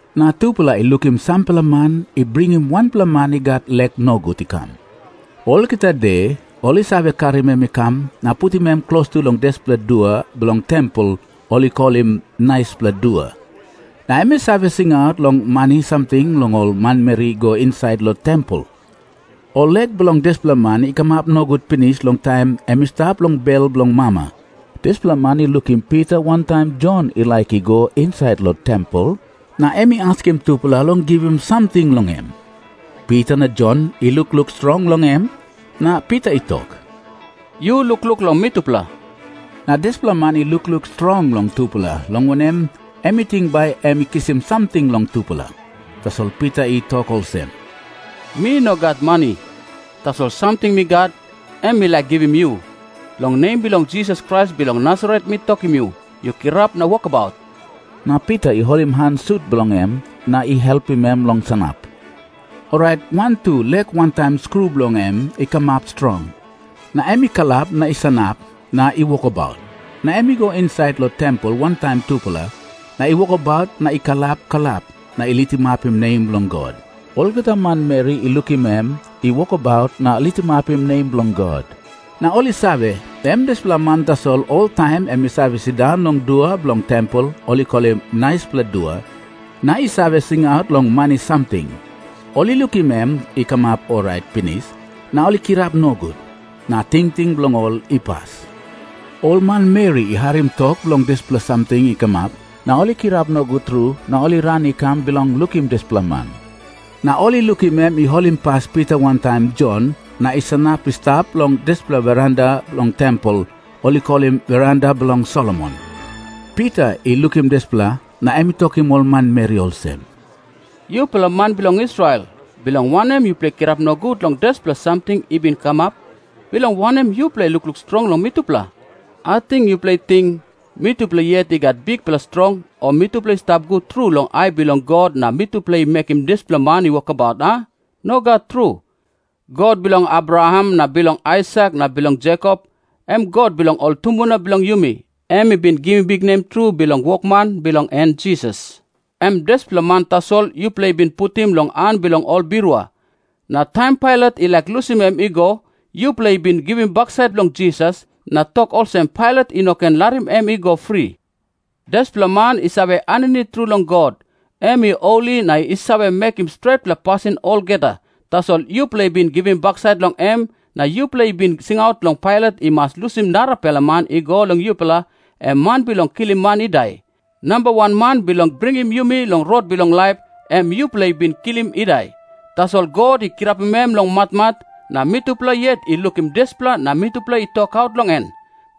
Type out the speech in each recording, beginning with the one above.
Na tupela i lukim sampela man i bringim wanpela man i gat lek nogut i kam. Olgeta de ol i save karim em i kam na putim em klostu long dispela dua bilong tempel ol i kolim Naispela Dua. Na em i save singaut long mani samting long ol manmeri i go insait long tempel. Ol lek bilong dispela man i kamap nogut pinis long taim em i stap long bel bilong mama. Dispela man i lukim Pita wantaim Jon i laik i go insait long tempel, na em i askim tupela long givim samting long em. Pita na Jon i lukluk strong long em, na Pita i tok, "Yu lukluk long mitupela." Na dispela man i lukluk strong long tupela, long wanem, em i ting bai em i kisim samting long tupela. Tasol Pita i tok olsem, "Mi no gat mani. Tasol samting mi gat, em mi laik givim yu. Long nem bilong Jisas Krais bilong Nasaret mi tokim yu, yu kirap na wokabaut." Na Pita i holim han sut bilong em na i helpim em long sanap. Orait wantu lek wantaim skru bilong en i kamap strong. Na em i kalap na i sanap na i wokabaut. Na em i go insait long tempel wantaim tupela, na i wokabaut na i kalap kalap na i litimapim nem bilong God. Olgeta manmeri i lukim em i wokabaut na litimapim nem bilong God, na ol i save, em dispela man tasol oltaim em i save sindaun long dua bilong tempel ol i kolim Naispela Dua, na i save singaut long mani samting. Ol i lukim em i kamap orait pinis, na ol i kirap nogut, na tingting bilong ol i pas. … Ol manmeri i harim tok long dispela samting i kamap, na ol i kirap nogut tru na ol i ran i kam bilong lukim dispela man. Na ol i lukim em i holimpas Pita wantaim Jon na i sanap i stap long dispela veranda bilong tempel ol i kolim Veranda bilong Solomon. Pita i lukim dispela, na em i tokim ol manmeri olsem, "Yupela man bilong Israel, bilong wanem yupela i kirap nogut long dispela samting i bin kamap? Bilong wanem yupela i lukluk strong long mitupela? Ating yupela i ting, mitupela yet i gat bikpela strong o mitupela i stap gut tru long ai bilong God na mitupela i mekim dispela man i wokabaut, a? Nogat tru. God bilong Abraham na bilong Aisak na bilong Jekop, em God bilong ol tumbuna bilong yumi, em i bin givim biknem tru bilong wokman bilong en Jisas. Em dispela man tasol yupela i bin putim long han bilong ol birua. Na taim Pailat i laik lusim em i go, yupela i bin givim baksait long Jisas na tok olsem Pailat i no ken larim em i go fri. Dispela man i save aninit tru long God. Em i holi na i save mekim stretpela pasin olgeta, tasol yupela i bin givim baksait long em na yupela i bin singaut long Pailat i mas lusim narapela man i go long yupela, em man bilong kilim man i dai. Namba wan man bilong bringim yumi long rot bilong laip, em yupela i bin kilim i dai. Tasol God i kirapim em long matmat, na mitupela yet i lukim dispela na mitupela i tokaut long en.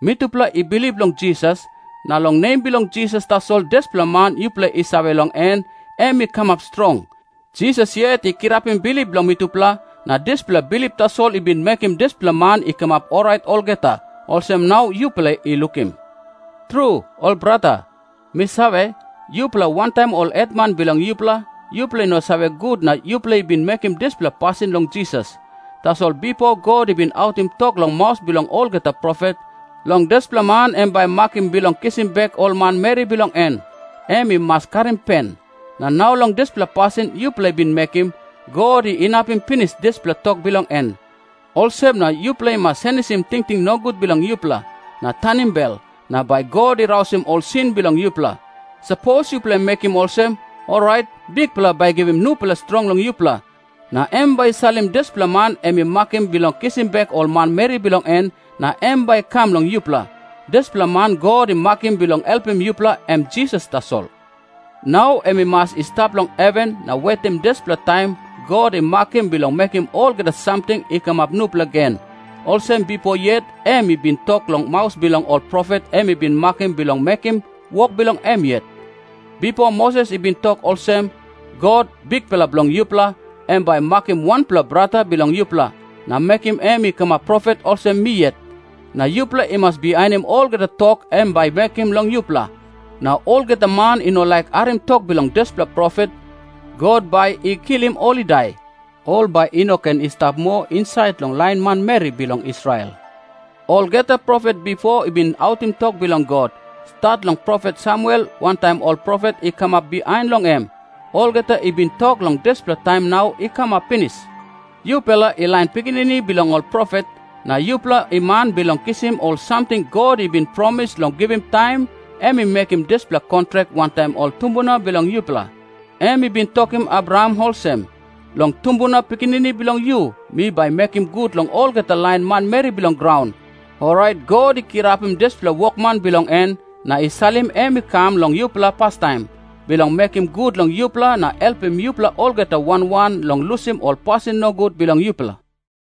Mitupela i bilip long Jisas, na long nem bilong Jisas tasol dispela man yupela i save long en, em i kamap strong. Jisas yet i kirapim bilip bilong mitupela, na dispela bilip tasol i bin mekim dispela man i kamap orait olgeta, olsem nau yupela i lukim. "Tru, ol brata, mi save, yupela wantaim ol hetman bilong yupela, yupela i no save gut na yupela i bin mekim dispela pasin long Jisas. Tasol bipo God i bin autim tok long maus bilong olgeta profet, long dispela man em bai i makim bilong kisim bek ol manmeri bilong en, em i mas karim pen. Na nau long dispela pasin yupela i bin mekim, God i inapim pinis dispela tok bilong en. "Olsem na yupela i mas senisim tingting nogut bilong yupela, na tanim bel, na bai God i rausim ol sin bilong yupela. Sapos yupela i mekim olsem, orait Bikpela bai i givim nupela strong long yupela. Na em bai i salim dispela man em i makim bilong kisim bek ol manmeri bilong en, na em bai i kam long yupela. Dispela man God i makim bilong helpim yupela, em Jisas tasol. Nau em i mas i stap long heven na wetim dispela taim God i makim bilong mekim olgeta samting i kamap nupela gen, olsem bipo yet em i bin tok long maus bilong ol profet em i bin makim bilong mekim wok bilong em yet. "Bipo Moses i bin tok olsem, 'God, Bikpela bilong yupela, em bai i makim wanpela brata bilong yupela, na mekim em i kamap profet olsem mi yet. Na yupela i mas bihainim olgeta tok em bai i mekim long yupela. Na olgeta man i no laik harim tok bilong dispela profet, God bai i kilim ol i dai. Ol bai i no ken i stap moa insait long lain manmeri bilong Israel.' Olgeta profet bipo i bin autim tok bilong God, stat long profet Samuel wantaim ol profet i kamap bihain long em, olgeta i bin tok long dispela taim nau i kamap pinis. "Yupela i lain pikinini bilong ol profet, na yupela i man bilong kisim ol samting God i bin promis long givim taim em i mekim dispela kontrak wantaim ol tumbuna bilong yupela. Em i bin tokim Abraham olsem, 'Long tumbuna pikinini bilong yu mi bai mekim gut long olgeta lain manmeri bilong graun.' Orait God i kirapim dispela wokman bilong en, na i salim em i kam long yupela pastaim, bilong mekim gut long yupela na helpim yupela olgeta wan wan long lusim ol pasin nogut bilong yupela."